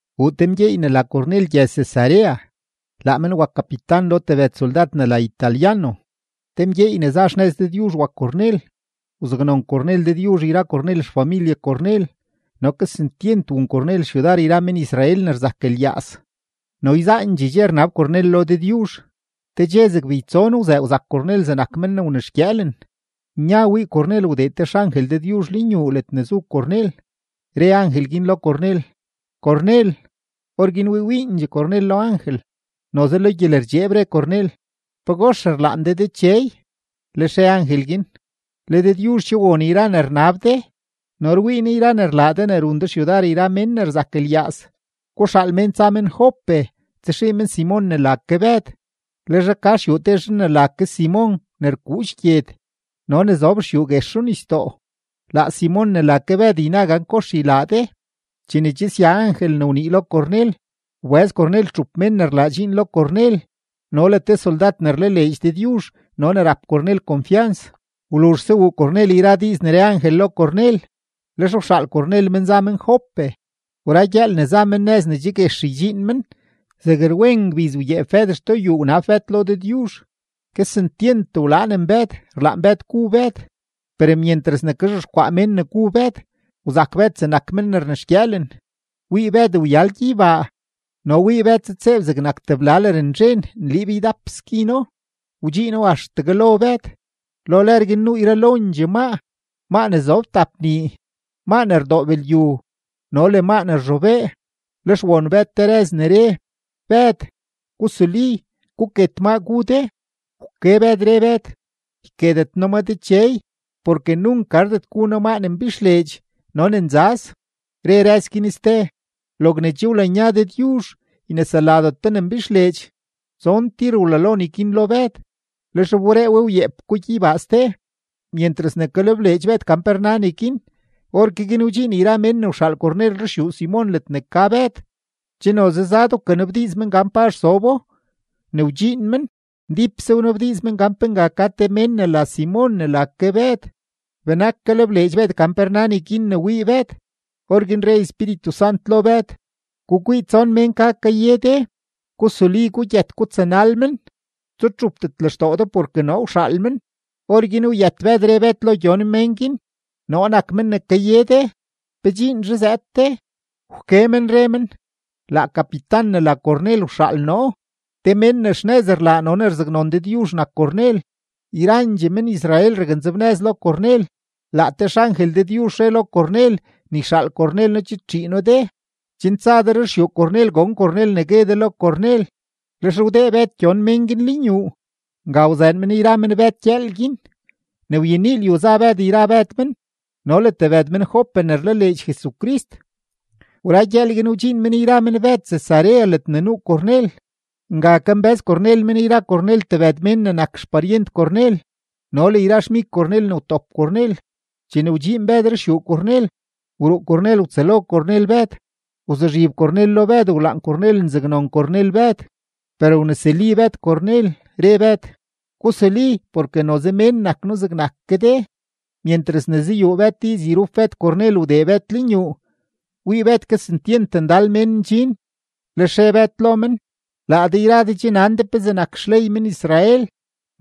Wuu te mgyeey ne la Cornel gyëz-Cesarea, laa men wak kapitan lo tebëd soldad ne la Italiano. Te mgyeey ne za xnëz Dëdyuzh wak Cornel, wzaknon Cornel Dëdyuzh yra Cornel xfamilye Cornel no kesentyent wun Cornel xyudar yra men-Israel ne rzak lyaaz no yzaandxee dxe rnab Cornel lo Dëdyuzh. Te dxe zeg beytson wzëë wzak Cornel zegnak men ne wnexgyëëlen; nya wii Cornel wdee te xangel Dëdyuzh lenyuu ledne zu Cornel, re angel guin lo Cornel: ―¡Cornel! Orguin wii wiindxee Cornel lo angel, noze lo gyelerdxeeb re Cornel: ―¿Pagox rlaan de Dechey? Lex re angel guin: ―Le Dëdyuzh che won yra ne rnab de no rwii Ne yra ne rlaa de ne run de xyudar yra mén ne rzak lyaaz. Guxaal mén tsa men Jope tsaxii men Simon ne la ke Bëd; le zhaa ka xyuu te zhan ne la ke Simon ne rkuudx gyed no ne zob xyuu guex runisdoo. Laa Simon ne la ke Bëd yna gan kox ylaa de. Chene che sya angel ne wnii lo Cornel, wbëz Cornel txup mén ne rlaa dxiin lo Cornel no le te soldad ne rlaleedx Dëdyuzh no ne rap Cornel konfyans. Wluzhse wuu Cornel yra diiz ne re angel lo Cornel, lex wxaal Cornel men za men Jope. Wra gyëël ne za men nëz ne che guex ydxiin men, zeg rwen ngbiz wyeep Bëd xtoo yuu wnab Bëd lo Dëdyuzh. Kesentyent wlaanen Bëd, rlaan Bëd gu Bëd; per myentras ne kazhexkwaa mén ne gu Bëd, wzak Bëd zegnak men ne rnexgyëëlen. Wii Bëd wyal gyeybaa no wii Bëd zëdtseeb zegnak tebla lërnzhen nliib ydap skino, wdxiino axtegue lo Bëd. Lo lër guin nuu yralondxee maa, maa ne zob tap nii, maa ne rdoob lyu, no le maa ne rzhobee. Lex won Bëd te rëz ne re: ―Bëd, gusuli, guket maa gu de. Wke Bëd, re Bëd: ―Yketet noo ma Dechey, porke nunk gardet gu noo maa ne mbixleedx no ne nzaz. Re rëz guin ste: ―Logne che wlanya Dëdyuzh, yneseladet do ne mbixleedx. Tson tir wlalo neguin lo Bëd, lex wberee we wyeep ko gyeybaa ste. Myentras ne kalebleedx Bëd gan pe rna neguin, orke guin wdxiin yra mén ne wxaal Cornel ruxyuu Simon ledne ka Bëd; che noze zad wkanabdiiz men gan pazh zobo. Ne wdxiin men, ndípse wnabdiiz men gan pe nga ka te mén ne la Simon ne la ke Bëd. Benak kalebleedx Bëd gan pe rna neguin ne wii Bëd, orguin re Espíritu Sant lo Bëd: ―Gukwii, tson mén ka kaye de. Gusuli, gugyët, gutsanal men; tsutxupdet lextoo de porke noo wxaal men. Orguin wyët Bëd re Bëd lo gyon mén guin: ―Noo nak men ne kaye de. ¿Pe dxiinzhe zëëd de? Wke men re men: ―Laa kapitan ne la Cornel wxaal noo; te mén ne xnëz rlaa no ne rzaknon Dëdyuzh nak Cornel; yrandxee men-Israel raknzebnëz lo Cornel. Laa te xangel Dëdyuzh re lo Cornel ne yxaal Cornel noo chidtxii noo de, chen tsa de ruxyuu Cornel, gon Cornel ne gue de lo Cornel. Lex wdee Bëd gyon mén guin lenyuu, nga wzëën men yra men Bëd gyëël guin. Ne wyenii lyu za Bëd yra Bëd men no le tebëd men-Jope ne rlaleedx Jesucrist. Wra gyëël guin, wdxiin men yra men Bëd Cesarea ledne nuu Cornel. Nga kambë́z Cornel men yra Cornel tebëd mén ne nak xparyent Cornel no le yra xmig Cornel ne wtop Cornel. Chene wdxiin Bëd xyuu Cornel, wruu Cornel wtsëlo Cornel Bëd; wzuzhib Cornel lo Bëd wlaan Cornel nzaknon Cornel Bëd. Per wnesuli Bëd Cornel, re Bëd: ―Gusuli, porke noze mén nak noo zegnak ke de. Myentras ne zayuu Bëd diiz yrup Bëd Cornel, wdee Bëd lenyuu, wii Bëd kesentyent ndal mén ndxin. Lex re Bëd lo men: ―Laa de yra de che nan de pezee nak xley men-Israel,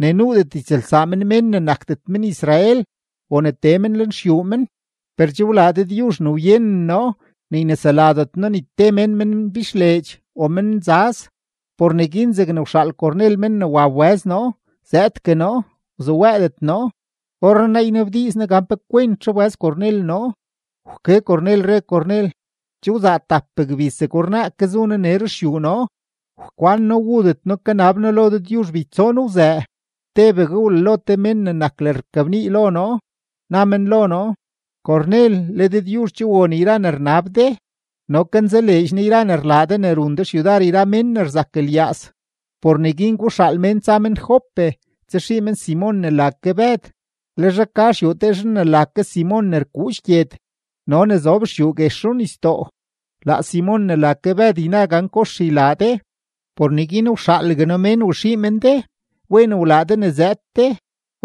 ne nuudet ytsëlsaa men mén ne nakdet men-Israel o ne tee men lenxyuu men. Per che wlaa Dëdyuzh ne wyenen noo ne yneseladet noo ni te mén men mbixleedx o men nzaz. Por neguin zegne wxaal Cornel men ne wa wbëz noo, zëëdgue noo, wzuwëëdet noo. Orrenaa ynabdiiz noo gan pe kwentzhe wbëz Cornel noo. Wke Cornel, re Cornel: ―Che wzaa tap gbiz zeg ornaa ke zu noo nee ruxyuu noo, wkwan noo wudet noo, kanab noo lo Dëdyuzh beytson wzëë, tebegue wlalo te mén ne nak lërrkabnii lo noo. Na men lo noo: “Cornel, le Dëdyuzh che won yra ne rnab de no kanzaleedx Ne yra ne rlaa de ne run de xyudar yra mén ne rzak lyaaz. Por neguin guxaal mén tsa men Jope tsaxii men Simon ne la ke Bëd; le zhaa ka xyuu te zhan ne la ke Simon ne rkuudx gyed no ne zob xyuu guex runisdoo. Laa Simon ne la ke Bëd yna gan kox ylaa de.” Por neguin wxaalgue noo mén waxii men de. Wen wlaa de ne zëëd de.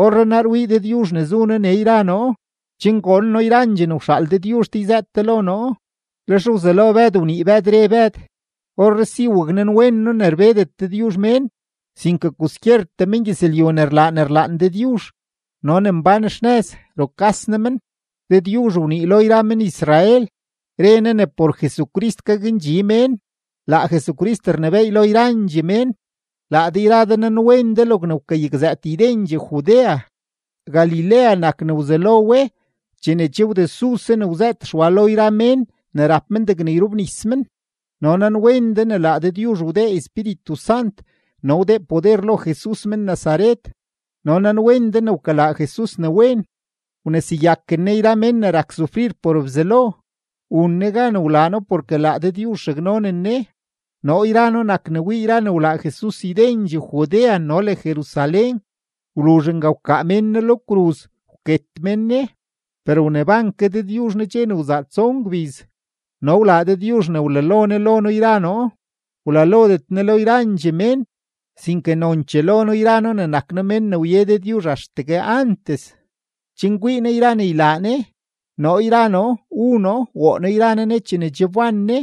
Orrenaa rwii Dëdyuzh zu noo nee yra noo, chen gon noo yrandxee ne wxaal Dëdyuzh de yzëët de lo noo. Lex wzelo Bëd wnii Bëd, re Bëd: ―Orree si waknanwen noo ne rbedet Dëdyuzh mén, sinke kwaskyertee mengyëzlyu ne rlaa ne rlaan Dëdyuzh no ne mbán xnëz, rukas Ne men. Dëdyuzh wnii lo yra men-Israel, re Ne ne por Jesucrist gakndxi mén; laa Jesucrist rnebééy lo yrandxee mén. Laa de yra de nanwen de logne wkayakzëët ydendxee Judea, Galilea nak ne wzelo we chene che wdesuse ne wzëët Xwa lo yra mén ne rap men degne yrobnis men. No nanwen de ne laa Dëdyuzh wdee Espíritu Sant no wdee poder lo Jesus men-Nazaret, no nanwen de ne wkalaa Jesus ne wen, wneseyaken Ne yra mén ne rak sufrir por Bzelo. Wun Ne gan wlaa No porke laa Dëdyuzh raknonen Ne. Noo yra noo nak ne wii yra ne wlaa Jesus ydendxee Judea no le Jerusalén. Wluzh nga wkaa mén Ne lo kruz, wket mén Ne. Per wneban ke Dëdyuzh Ne dxe ne wzaa tson gbiz no wlaa Dëdyuzh ne wlalo Ne lo noo yra noo. Wlalodet Ne lo yrandxee mén sinke nonchee lo noo yra noo ne nak noo men ne wye Dëdyuzh axtegue antes, chen kwii noo yra ne ylaa Ne. Noo yra noo wu noo, woo noo yra noo Ne chene che wban Ne.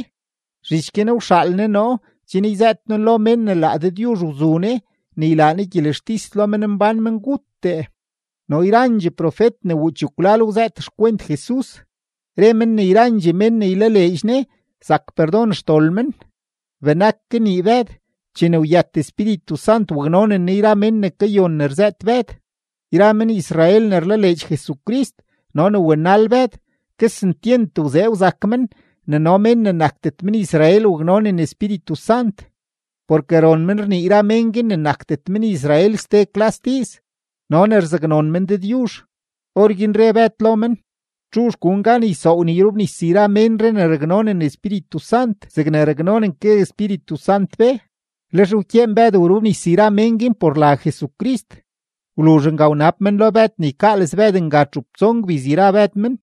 Zhich guin wxaal Ne noo chen yzëët noo lo mén ne laa Dëdyuzh wzu Ne ne ylaa Ne gyelextis lo menmbán menguttee. No yrandxee profet ne wuu chekwlal wzëët xkwent Jesus, re men ne yrandxee mén ne ylaleedx Ne zak perdon xdol men. Benak kanii Bëd, chene wyët Espíritu Sant waknonen Ne yra mén ne kayon ne rzëët Bëd. Yra men-Israel ne rlaleedx Jesucrist no ne wanal Bëd, kesentyent wzee wzak men ne no mén ne nakdet men-Israel waknonen Espíritu Sant. Porke ron men rnii yra mén guin ne nakdet men-Israel ste klas diiz no ne rzaknon men Dëdyuzh. Orguin re Bëd lo men: ―¿Txuzh gun gan ysoow ne yrobnis yra ménree ne raknonen Espíritu Sant zegne raknonen ke Espíritu Sant be? Lex wkyeen Bëd wrobnis yra mén guin por la Jesucrist. Wluzh nga wnab men lo Bëd ne ykaales Bëd nga txup tson gbiz yra Bëd men.